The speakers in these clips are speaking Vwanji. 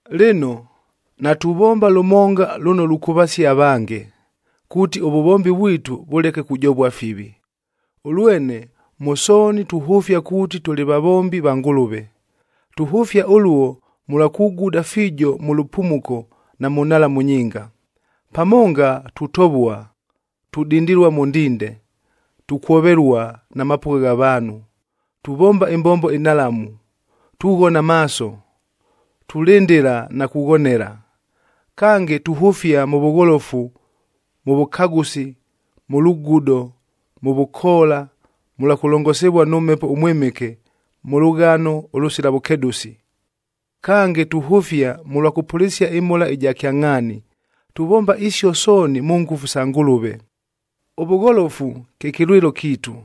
Lɨno, natuvomba lʉmonga lʉno lukʉvasia avange, kuuti ʉvʉvombi vwitu vʉleke kujovua fivi. Ʉlwene mʉ sooni tuhʉfia kuuti tʉlɨ vavombi va Ngʉlʉve. Tuhʉfia ʉluo mʉlwa kuguda fiijo mʉ lʉpumuko na mʉ nhalamu nyinga. Pamonga tutovua, tudindilua mʉ ndinde, tukwovelua na mapʉgha gha vaanhu, tuvomba ɨmbombo ɨnhalamu, tughona maaso, tulɨndɨla na kughonela. Kange, tuhʉfia mʉ vʉgholofu, mʉ vʉkagʉsi, mʉ lugudo, mʉ vʉkoola, mʉlwa kʉlongosivua nʉ Mhepo ʉMwɨmɨke, mʉ lʉghano ʉlʉsila vʉkedʉsi. Kange, tuhʉfia mʉlwa kʉpʉlɨsia ɨmhola ɨja kyangʼhaani, tuvomba isio sooni mʉ ngʉfu sa Ngʉlʉve. Ʉvʉgholofu, kye kɨlwɨlo kiitu,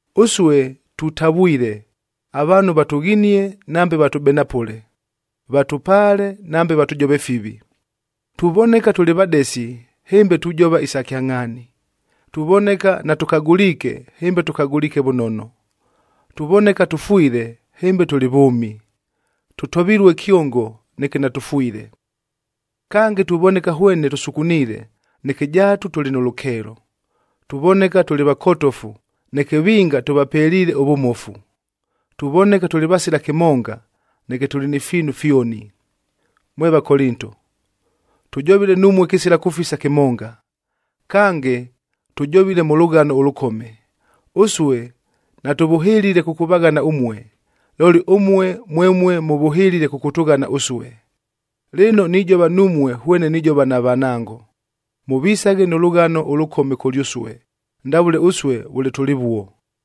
Ʉsue tutavwile, avaanhu vatʉghinie nambe vatʉbenapʉle; vatʉpaale nambe vatʉjove fivi. Tuvoneka tʉlɨ vadesi, hɨmbe tujova isa kyangʼhaani; tuvoneka natʉkagʉliike, hɨmbe tʉkagʉliike vʉnono; tuvoneka tʉfwile, hɨmbe tʉlɨ vʉʉmi; tʉtovilue kyongo, neke natʉfwile. Kange, tuvoneka hwene tʉsukuniile, neke jaatu tʉlɨ nʉ lʉkeelo; tuvoneka tʉlɨ vakotofu, neke vinga tʉvapeliile ʉvʉmofu; tuvoneka tʉlɨ vasila kɨmonga, neke tʉlɨ ni fiinu fyoni. Mwe Vakolinto, tʉjovile numue kɨsila kʉfisa kɨmonga, kange tʉjovile mʉ lʉghano ʉlʉkome. Ʉsue natʉvʉhɨlile kʉkʉvaghana ʉmue, looli ʉmue, mwemue mʉvʉhɨlile kʉkʉtʉghana ʉsue. Lɨno, nijova numue hwene nijova na vanango, mʉvisaghe nʉ lʉghano ʉlʉkome kʉlyʉsue, ndavʉle ʉsue vʉle tʉlɨvuo.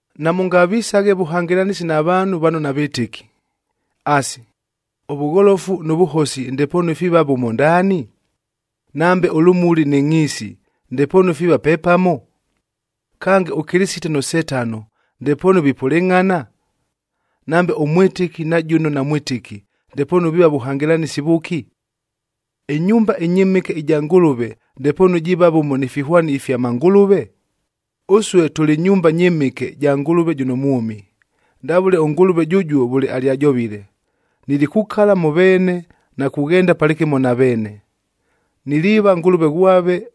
Namʉngavisaghe vʉhangɨlanɨsi na vaanhu vano navɨtɨki. Asi, ʉvʉgholofu nʉ vʉhosi ndepoonu fiiva vʉmo ndaani? Nambe ʉlʉmuli nɨ ngʼhiisi ndepoonu fiiva pepamo? Kange, ʉKɨlɨsite nʉ Setano ndepoonu vipʉlɨngʼhana? Nambe ʉmwɨtɨki na jʉno namwɨtɨki, ndepoonu viiva vʉhangɨlanɨsi vʉki? Ɨnyumba ɨnyɨmɨke ɨja Ngʉlʉve ndepoonu jiiva vʉmo ni fihwani ifya mangʉlʉve? Ʉsue tʉlɨ nyumba nyɨmɨke ja Ngʉlʉve jʉno mwʉmi! Ndavʉle ʉNgʉlʉve jʉjuo vʉle alyajovile, “Nilikukala mʉ veene na kughenda palɨkɨmo na veene. Niliiva Ngʉlʉve ghwave,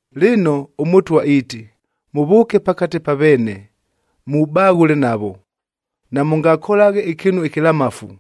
Lɨno, ʉMʉtwa iiti, “Mʉvʉʉke pakate pa veene, mubaghʉle navo. Namʉngakolaghe ɨkɨɨnu ɨkɨlamafu,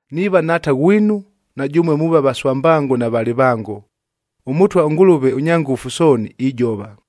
Niiva Nhaata ghwinu, na jʉmue muuva vaswambango na valɨvango. ɄMʉtwa ʉNgʉlʉve ʉNyangʉfu Sooni, ijova!